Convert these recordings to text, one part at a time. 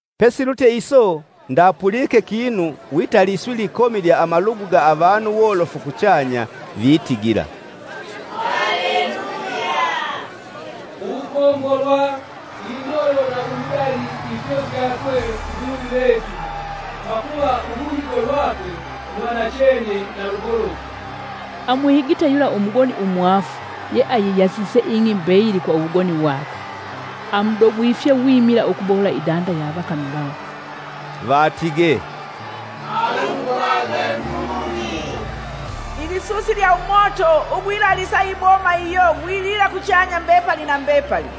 Pesilutye iso ndapulike kinu wita liswi likomi lya amalugu ga avanu wolofu kuchanya, vitigila “Haleluya! Uwukombolwa, indolo na uludali ifyo fyakwe Nguluvi vetu! Pakuva uluhigo lwakwe lwa nachene na lugolofu. Amuhigite yula umugoni umwaafu ye ayiyasise ing'i mbeyili kwa uwugoni wakwe. Amudogwifye wimila ukubohola idanda ya avakami vakwe!” Vatigee, “Alumbwagwe Nguluvi! Ilisusi lya umoto ugwilalisa iboma iyo gwilila kuchanya mbepali na mbepali!”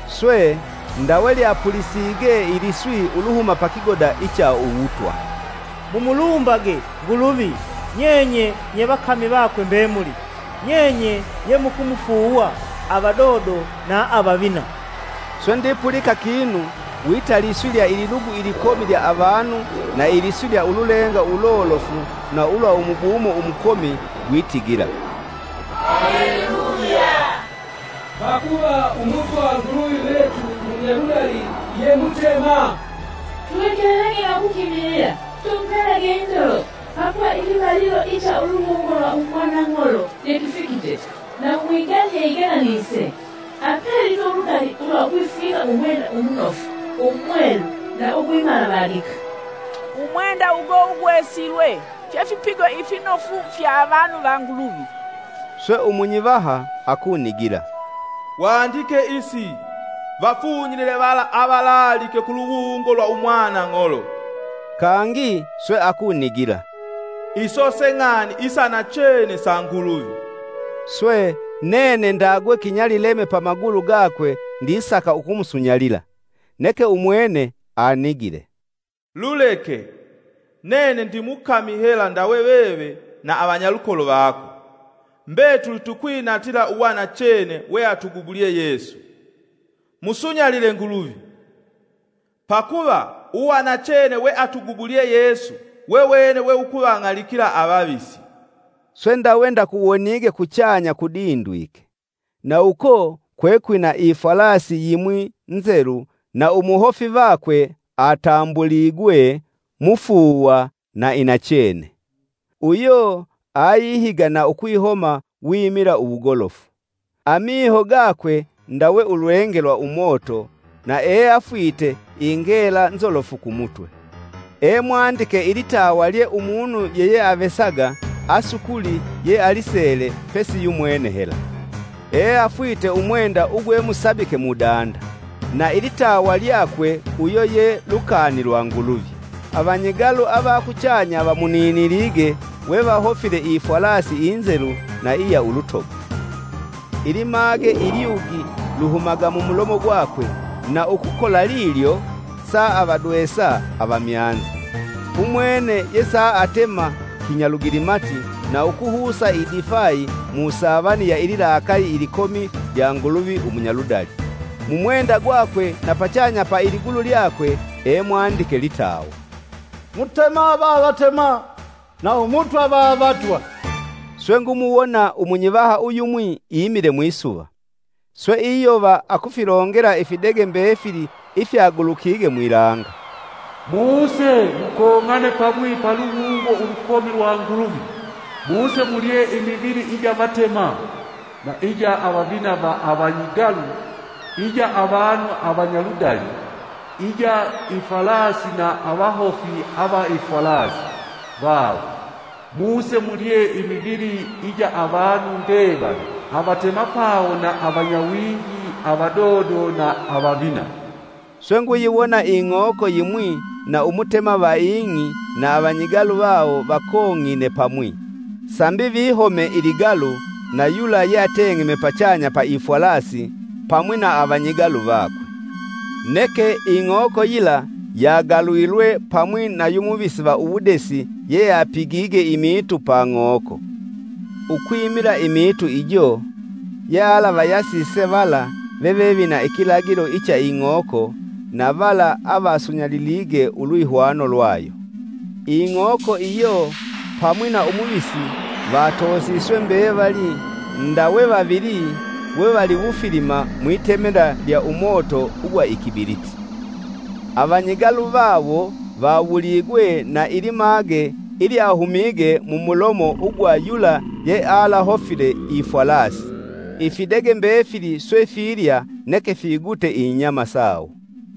Swe, ndawe lyapulisige iliswi uluhuma pakigoda icha uwutwa. “Mumulumbage, Nguluvi, nyenye nye vakami vakwe mbemuli, nyenye yemukumufuuwa, avadodo na avavina.” Swe ndipulika kinu wita liswi lya ililugu ilikomi lya avanu na iliswi lya ululenga ulolofu na ulwa umubumo umukomi, gwitigila, “Haleluya! Pakuva Umutwa Nguluvi vetu Munyaludali ye Mutema! Tuhekelelage na ukukimilila, tumupelage indolo, pakuva ikivalilo icha uluwungo lwa umwanang'olo yekifikite, na umwigani yeigelanise. Apelitwe uludali ulwa ukwifwika umwenda umunofu umwelu na ugwimalavadika!” (umwenda ugo ugwesilwe fye fipigo ifinofu fya avanu va Nguluvi.) Swe umunyivaha akunigila, “Wandike isi: Vafunyilile vala avalaalike kuluwungo lwa umwana Ng'olo!” Kangi swe akunigila, “Iso se ng'ani isa nachene sa Nguluvi.” Swe, nene ndagwe kinyalileme pamagulu gakwe ndisaka ukumusunyalila. Neke umwene anigile, “Luleke! Nene ndimukami hela ndawe veve na avanyalukolo vako; mbetuli tukwinatila uwanachene weatugubulye Yesu. Musunyalile Nguluvi! Pakuva uwanachene weatugubulye Yesu wewene we wukuvang'alikila avavisi.” Swe ndawe ndakuwonige kuchanya kudindwike; na uko kwekwina ifwalasi yimwi nzelu na umuhofi vakwe atambuligwe, “Mufuuwa na Inachene.” Uyo ayihiga na ukwihoma wimila uwugolofu. Amiho gakwe ndawe ulwenge lwa umoto, na eafwite ingela nzolofu kumutwe. Emwandike ilitawa lye umunu yeyeavesaga asukuli yealisele pesi yumwene hela. Eafwite umwenda ugwe musabike mudanda. Na ilitawa lyakwe uyo ye, “Lukani lwa Nguluvi.” Avanyigalu avakuchanya, vamuninilige we vahofile ifwalasi inzelu na iya ulutogo. Ilimage ilyugi luhumaga mumulomo gwakwe, na ukukola lilyo saavadwesa avamyanza. Umwene ye saatema kinyalugilimati na ukuhusa idifai mu savani ya ililakaali ilikomi lya Nguluvi umunyaludali. Mumwenda gwakwe, na pachanya pa iligulu lyakwe, emwandike litawa, “Mutema va Avatema na Umutwa va Avatwa.” Swe ngumuwona umunyivaha uyumwi imile mwisuva. Swe iyova akufilongela ifidege mbefili ifya gulukige mwilanga, “Muse! Mukong'ane pamwi paluwungo ulukomi lwa Nguluvi. Muse mulye imivili ija avatema, na ija avavina va avanyigalu, ija avanu avanyaludali, ija ifwalasi na avahofi ava ifwalasi vawo, muse mulye imivili ija avanu mbevali avatemapawo na avanyawingi, avadodo na avavina.” Swe Nguyiwona ing'oko yimwi na umutema va ing'i na avanyigalu vawo vakong'ine pamwi sambi vihome iligalu na yula yeateng'eme pachanya pa ifwalasi, pamwi na avanyigalu vakwe. Neke ing'oko yila yagalulwe pamwi na yu muvisi va uwudesi yeapigige imiitu pa ng'oko. (Ukwimila miitu ijo, yealavayasise vala veve vina ikilagilo icha ing'oko, na vala avasunyalilige ulwihwano lwayo.) Ing'oko iyo pamwi na umuvisi vatoosiswe mbevali nda we vavili wevaliwufilima, mwitemela lya umoto ugwa ikibiliti. Avanyigalu vawo vawuligwe na ilimage ilyahumige mumulomo ugwa yula yealahofile ifwalasi. Ifidege mbefili swe filya neke figute inyama sawo.